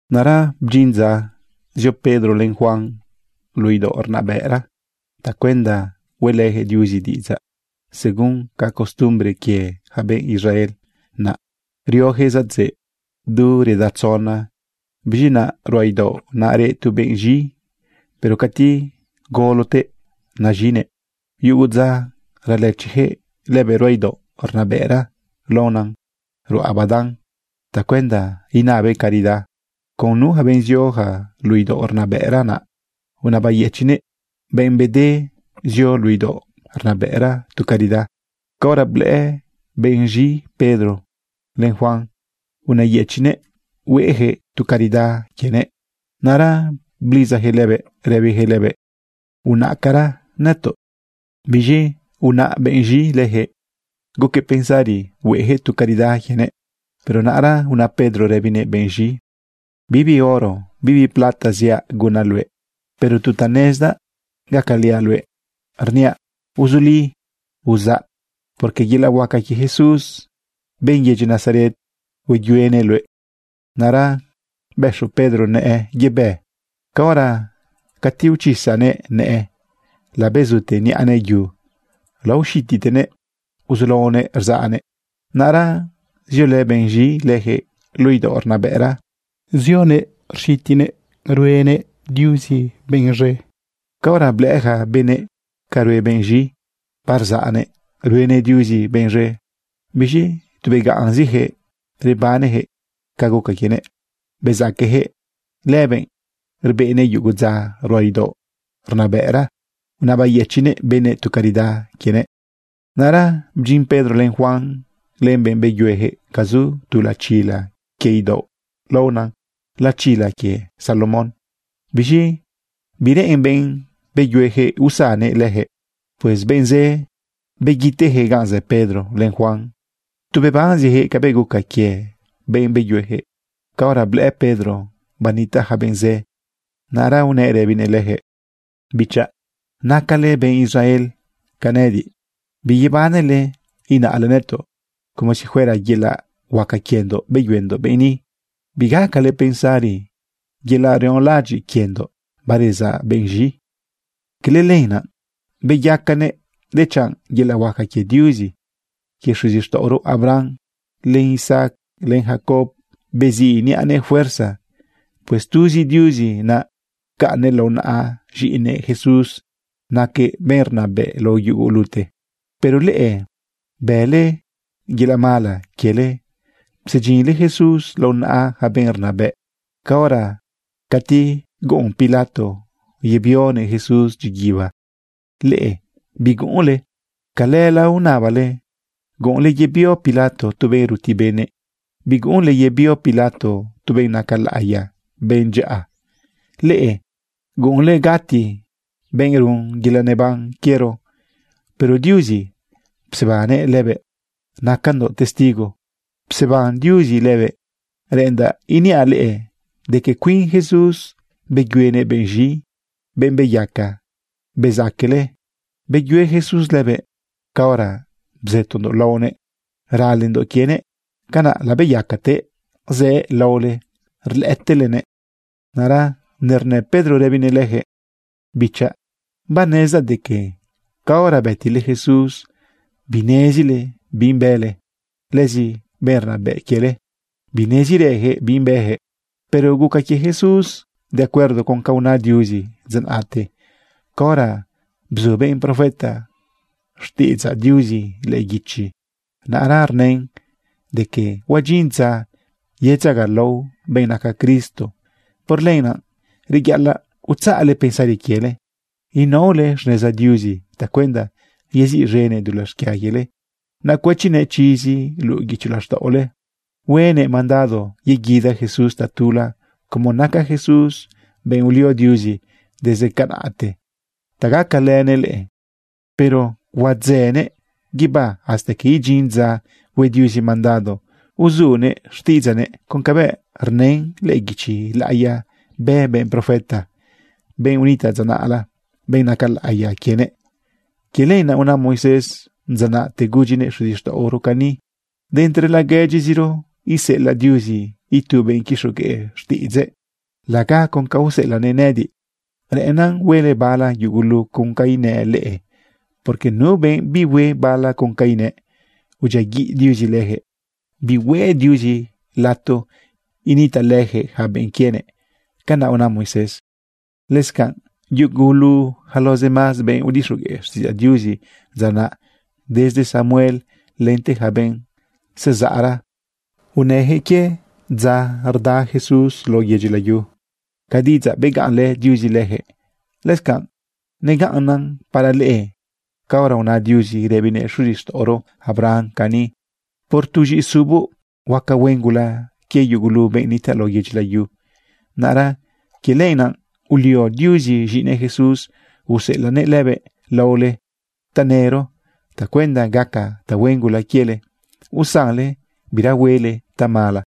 Naꞌra bdyin dza zio Pedro len Juan luꞌu idaoꞌ rnabëꞌra tacuenda hueꞌlëyaquëꞌ Diuzi diꞌidzaꞌ. Según ca costumbre quie ja benꞌ Israel naꞌ, rioyaquëꞌ zadzëꞌ du reda tzona. Biz̃i naꞌ ruꞌa idaoꞌ naꞌ reꞌ tu benꞌ z̃i, pero cati golotëꞌ naz̃inëꞌ. Yugu dza ralëchiyaquëꞌ lëbëꞌ ruꞌa idaoꞌ rnabëꞌra laonan ruꞌa badan tacuenda inabëꞌ caridad con nu benꞌ zioja luꞌu idaoꞌ rnabëꞌra naꞌ. Unabayëchiꞌnëꞌ benꞌ bede zio luꞌu idaoꞌ rnabëꞌra tu caridad. Caora blëꞌë benꞌ z̃i Pedro len Juan, unëyëchiꞌnëꞌ hueꞌyaquëꞌ tu caridad quienëꞌ. Naꞌra blidzayaquëꞌ lëbëꞌ rëbijëꞌ lëbëꞌ: ―¡Unaꞌcara nëtoꞌ! Biz̃i unaꞌ benꞌ z̃i leyaquëꞌ guquëꞌ pensari hueꞌyaquëꞌ tu caridad quienëꞌ. Pero naꞌra una Pedro rëbinëꞌ benꞌ z̃i: ―Bibi oro, bibi plata, ziaꞌ gunaꞌ luëꞌ, pero tu ta nezdaꞌ gacaliaꞌ luëꞌ, rniaꞌ: ¡Uzuli! ¡Uzaꞌ! porque yelaꞌ huaca quie Jesús, benꞌ yedyi Nazaret, hueyuenëꞌ luëꞌ. Naꞌra bëxu Pedro nëꞌë yebë. Caora cati uchisanëꞌ nëꞌë, labezute niꞌanëꞌ yu, laoxititenëꞌ uzulaonëꞌ rzaꞌnëꞌ. Naꞌra ziolë benꞌ z̃i leyaquëꞌ luꞌu idaoꞌ rnabëꞌra, zionëꞌ rxitinëꞌ ruenëꞌ Diuzi benꞌ z̃e. Caora blëꞌë ja benëꞌ ca rue benꞌ z̃i, barzaꞌnëꞌ ruenëꞌ Diuzi benꞌ z̃e, biz̃i tu begaꞌnziyaquëꞌ rebaneyaquëꞌ ca guca quienëꞌ. Bezaqueyaquëꞌ lëbëꞌ ureꞌnëꞌ yugu dza ruꞌa idaoꞌ rnabëꞌra unabayëchiꞌnëꞌ benëꞌ tu caridad quienëꞌ. Naꞌra bdyin Pedro, len Juan, len benꞌ beyuejëꞌ ga zu tu lachila quie idaoꞌ laona lachila quie Salomón. Biz̃i bireꞌen benꞌ beyuejëꞌ usannëꞌ leyaquëꞌ. Pues benꞌ zë beguitejëꞌ gan zë Pedro len Juan, tu bebanzijëꞌ cabëꞌ guca quie benꞌ beyuejëꞌ. Caora blëꞌë Pedro banitaꞌ ja benꞌ zë, naꞌra unëꞌ rëbinëꞌ lejëꞌ: ―Bichaꞌ, nacale benꞌ Israel ca nëꞌëdiꞌ. Biyebanle inaꞌle nëtoꞌ como si fuera yelaꞌ huaca quiendoꞌ beyuendoꞌ benꞌ ni. Bigacale pensari yelaꞌ rionlaꞌadyiꞌ quiendoꞌ barezaꞌ benꞌ z̃i. Cala lenaꞌ beyacanëꞌ, dechanꞌ yelaꞌ huaca quie Diuzi quie xuzixtaꞌoro Abraham, len Isaac, len Jacob beziꞌ niꞌanëꞌ fuerza. Pues tuzi Diuzi naꞌ pcaꞌnnëꞌ lao naꞌa z̃iꞌinëꞌ Jesús naquëꞌ benꞌ rnabëꞌ lao yugulute. Pero leꞌe bële yelaꞌ mala quiele psedyinle Jesús lao naꞌa ja benꞌ rnabëꞌ. Caora cati guꞌun Pilato yebionëꞌ Jesús dyiguiba, leꞌe biguꞌunle. Calëla unabale guꞌunle yebio Pilato tu benꞌ ruti benëꞌ. Biguꞌunle yebio Pilato tu benꞌ naca laꞌiya, benꞌ dyaꞌa. Leꞌe guꞌunle gati benꞌ run yelaꞌ neban quiero, pero Diuzi psebannëꞌ lëbëꞌ. Nacandoꞌ testigo pseban Diuzi lëbëꞌ. Reꞌendaꞌ iniaꞌ leꞌe de que cuin Jesús beyuenëꞌ benꞌ z̃i, benꞌ beyaca bezaquele. Beyue Jesús lëbëꞌ caora bzëtondoꞌ laonëꞌ ralendoꞌ quienëꞌ. Canaꞌ labeyacatëꞌ zëꞌ laole rlëꞌëtelenëꞌ. Naꞌra nernë Pedro rëbinëꞌ leyaquëꞌ: ―Bichaꞌ, banezdaꞌ de que caora bëtile Jesús, binezile bi bële, lëzi benꞌ rnabëꞌ quiele, binezirëjëꞌ bi bëjëꞌ. Pero guca quie Jesús de acuerdo con ca una Diuzi dza naꞌte caora bzu benꞌ profeta xtiꞌidzaꞌ Diuzi lëꞌë guichi. Naꞌra rnën de que huadyin dza yedzagalao benꞌ naca Cristo. Por lenaꞌ reyaꞌalaꞌ utzaꞌle pensari quiele, inaole xneza Diuzi tacuenda yeziꞌz̃enëꞌ dulaꞌ xquia quiele, naꞌ cuëchinëꞌ chizi luꞌu guicho laxtaꞌole, huenëꞌ mandado yeguida Jesús tatula como naca Jesús benꞌ ulio Diuzi desde canaꞌte ta gacalënëꞌ leꞌe. Pero huadzënëꞌ guibá hasta que idyin dza hue Diuzi mandado uzunëꞌ xtiꞌidzaꞌnëꞌ con cabëꞌ rnën lëꞌë guichi laꞌiya bë benꞌ profeta, benꞌ unitaꞌ dza naꞌla, benꞌ naca laꞌiya quienëꞌ. Quie lenaꞌ una Moisés dza naꞌte gudyinëꞌ xuzixtaꞌoro cani: “De entre laguedyiziro iseꞌelaꞌ Diuzi itu benꞌ quixogueꞌ xtiꞌidzëꞌ laga con ca useꞌelaꞌnëꞌ nëꞌëdiꞌ. Reꞌennan huele bala yugulu con ca inëꞌ leꞌe. Porque nu benꞌ bihue bala con ca inëꞌ, udyiaguiꞌ Diuzi lëjëꞌ. Bihueꞌ Diuzi lato initaꞌlëjëꞌ yaca benꞌ quienëꞌ.” Canaꞌ una Moisés. ’Lëscanꞌ yugulu yaca los demás benꞌ udixogueꞌ xtiꞌidzaꞌ Diuzi dza naꞌ, desde Samuel lente yaca benꞌ zezaꞌra, unëjëꞌ quie dza rda Jesús lao yedyi layu. Ca diꞌidzaꞌ begaꞌnlë Diuzi leyaquëꞌ, lëscanꞌ negaꞌnnan para leꞌe caora una Diuzi rëbinëꞌ xuzixtaꞌoro Abraham cani: “Por tu z̃iꞌisuboꞌ huaca huen gula quie yugulu benꞌ nitaꞌ lao yedyi layu.” Naꞌra quie lenaꞌ ulio Diuzi z̃iꞌinëꞌ Jesús, useꞌelaꞌnëꞌ lëbëꞌ laole tanëro tacuenda gaca tahuen gula quiele, usanle bira huele tamala.